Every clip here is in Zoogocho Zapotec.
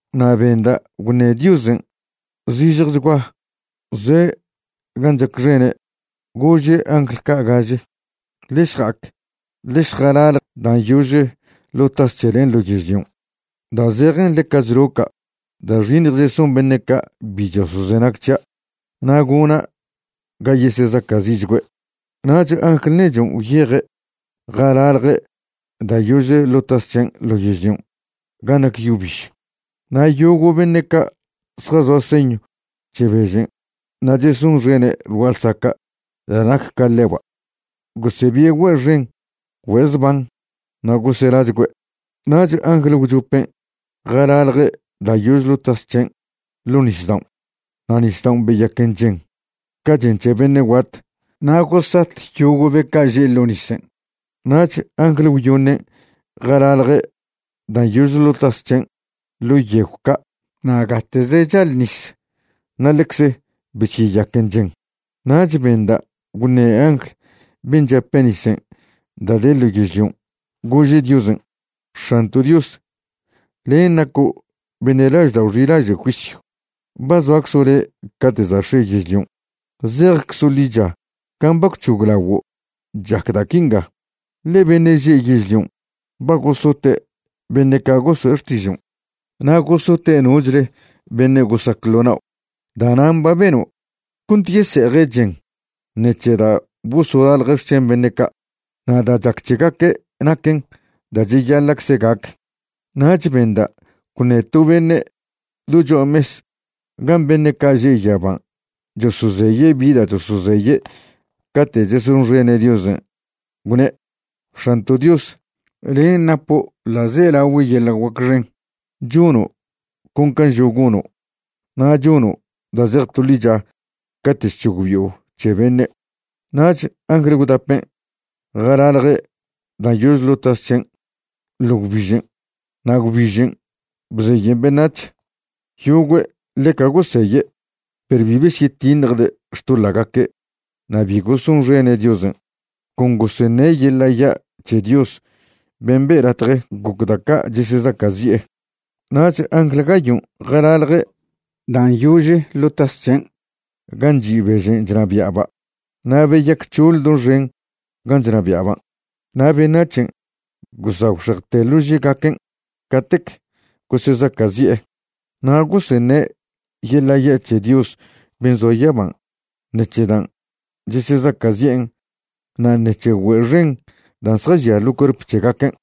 Na' benda' gwṉe Diosen' zižjechgua, zoe' gan' chacxene', gože' angl ca' gaže: ―Ḻe šja'ac ḻe šjalalj dan' yože ḻo' tas c̱helen' ḻo yežlion', da' zejen ḻeca chloca' da' xiṉj cheson beṉe' ca' bi chosozenag c̱hia', na' gona' ga yesezaca'zi'chgüe'. Nach angl nechon' gwyeje' jalalje' da' yože ḻo' tas c̱hen' ḻo yežlion' gan' nac yo biž, na' yogo' beṉe' ca' zjazoa señw c̱he bežen' na' chesonxene' ḻ gua'a ḻsaca' da' nac ca ḻeba', gosebie' güe' xen güe' zban na' goselachgüe'. Nach angl gwchopen' jalalje' da' yože ḻo' tas c̱hen' ḻo nisdaon' na' nisdaon' beyaquen chen ca chen c̱he beṉe' guat, na' gosat yogo' be ca' že' ḻo' nisen'. Nach angl gwyoṉen' jalalje' dan' yože ḻo' tas c̱hen' ḻo yegw ca' na' gate'ze chal nis na' ḻecze besyeyaquen chen. Nach benda' gwṉe angl ben' chape' nisen' da' de ḻo yežlion', gože' Diosen': ―X̱anto' Dios, len' naco' beṉe' laždao' xilaže' juisyw. Ba zoaczo' le' cate' za' x̱e yežlion'. Zejczo' ḻicha can' ba gwc̱hoglaguo' chac da' quinga, ḻe beṉe' že' yežlion' ba gosote' beṉe' ca' goso'e xtižon' na' gosote' nochle beṉe' gosac ḻo nao'. Da'nan' ba beno' cont yese'eje' chen ṉec̱he da' bosolalje' xc̱hen beṉe' ca'. Na' da' chac c̱hegaque' naquen da' cheyaḻa'cze gac. Nach benda' gwṉe to beṉe' do cho'a mes gan' beṉe' ca' že' yaban' chosozeye' bi da' chosozeye' cate' chesonxene' Diosen', gwne': ―X̱anto' Dios, len' napo' ḻa'zelagüe yeḻa' guac xen, chono' con can' žo' gono', na' chono' da' zej to ḻicha cate' chc̱hogbi'o c̱he beṉe'. Nach angl gwdapen' jalalje' dan' yože ḻo' tas c̱hen' ḻo gwbižen', na' gwbižen' bzeyen beṉac̱h. Yogüe' ḻeca goseye', perw bi besyetiṉjde' xtoḻa'gaque' na' bi gosonxene' Diosen', con goseṉe' yeḻa' ya' c̱he Dios ben' be' latje goc da' ca' chesezaca'zi'e. Nach angl gayon' jalalje' dan' yože ḻo' tas c̱hen' gan' chi' bežen' chnabia'ba' na' beyac c̱hoḻ doxen gan' chnabia'ban'. Na' beṉac̱hen' gosagwxejte lože'gaquen' catec gosesezaca'zi'e. Na' goseṉe' yeḻa' ya' c̱he Dios ben' zoa yaban' ṉec̱he dan' chesezaca'zi'en na' ṉec̱he güe' xen dan' zjažia ḻo cuerp c̱hegaquen',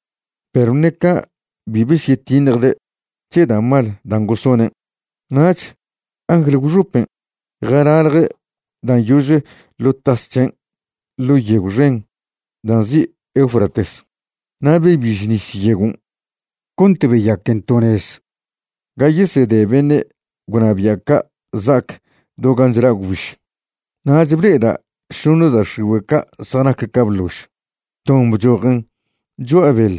perw ṉe ca' bi besyetiṉjde' c̱he da' mal dan' gosonen'. Nach angl gwxopen' jalalje' dan' yože ḻo' tas c̱hen' ḻo yegw xen da' nzi' Eufrates, na' bebiž nis yegon' cont beyaquen to nez ga yesede beṉe' gwnabia' ca' za'ac do gan' chla' gwbiž. Nach ble'eda' šoṉe da' x̱igüe' da' zjanac ca bḻož. Ton bchojen cho'a beḻ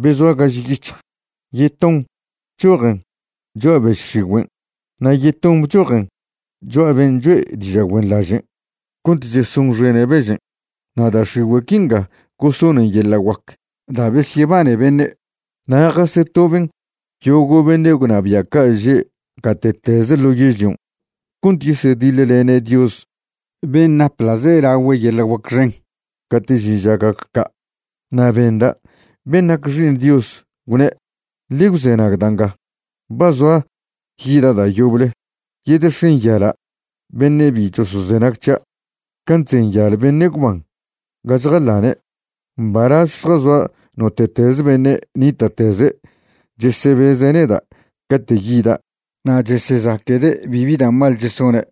be zoa gaž yic̱hj, yeton bchojen cho'a bež x̱igüen' na' yeton bchojen cho'a ben' cho'e diža' güenḻaže' cont chesonxene' bežen'. Na' da' x̱igüe' quinga gosonen yeḻa' guac da' besyebane beṉe', na' jasetoben yogo' beṉe' gwnabia' ca' že' gate'teze ḻo yežlion' cont yesediḻlene' Dios ben' nap ḻa'zelagüe yeḻa' guac xen cate' žin ža gac ca'. Na' benda' ben' nac Xi'iṉ Dios gwne': ―Ḻe gwzenag da' nga: ba zoa yida' da' yoble, yedexenyala' beṉe' bi chosozenag c̱hia' can' chzenyal beṉe' gwban ga chjaḻane'. Mbalaz zjazoa note'teze beṉe' nita'teze' chesebeze' neda' cate' yida' na' chesezaquede' bibi da' mal chesone',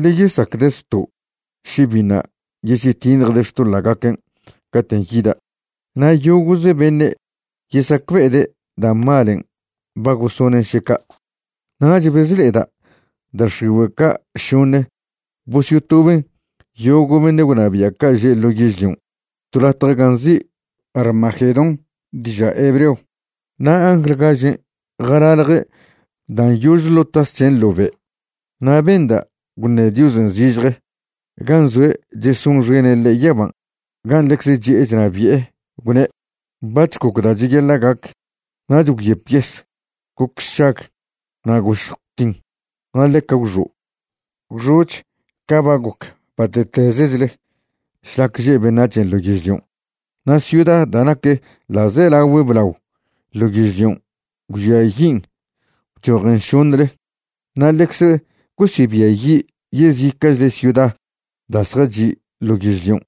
ḻe yesacde' zto' še biṉa' yesyetiṉjde' xtoḻa'gaquen' caten' yida', na' yogo'ze beṉe' yesacbe'ede' da' malen' ba gosonen' še ca'. Nach bezle'eda' da' x̱igüe' ca' šoṉe bosyotoben yogo' beṉe' gwnabia' ca' že' ḻo' yežlion' to latje ga nzi' Armagedón diža' hebreo. Na' angl gažen' jalalje' dan' yože ḻo' tas c̱hen' ḻo be', na' benda' gwṉe Diosen' zižje, gan' zoe' chesonxene' ḻe' yaban' gan' ḻecze chi'e chnabi'e, gwne': ―Bac̱h goc da' cheyaḻa' gac. Nach gwyep yes, goc sšag, na' gošj gwtin, na' ḻeca gwxo'. Gwxo'ch ca ba goc bate'tezechle šlac že' beṉac̱hen' ḻo yežlion'. Na' ciuda da' nac ḻa'zelagüe blao ḻo yežlion' gwžiayin' bchojen šoṉle, na' ḻecze gosebiayi' yezica'chle ciuda da' zjachi' ḻo yežlion'.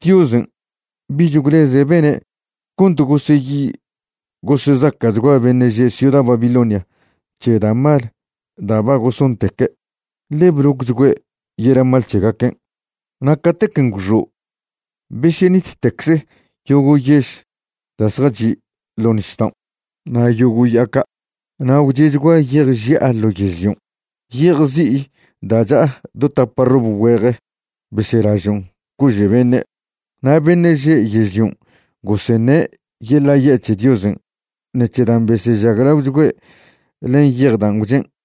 Diosen' bich gwleze' bene' cont goseyi gosezaca'chgua beṉe' že' ciuda Babilonia c̱he da' mal da' ba gosonteque', ḻe blocchgüe' yeḻa' mal c̱hegaquen'. Na' catequen' gwxo' besyenittecze yogo' yež da' zjachi' ḻo' nisdaon' na' yogo' ya'a ca'. Na' gwche'chgua yej ži'a ḻo yežlion', yej zi'i da' cha'a do tapa rob güeje beselažon' cože' beṉe'. Na' beṉe' že' yežlion' goseṉe' yeḻa' ya' c̱he Diosen' ṉec̱he dan' besežaglaochgüe' len yej dan' gwchen'.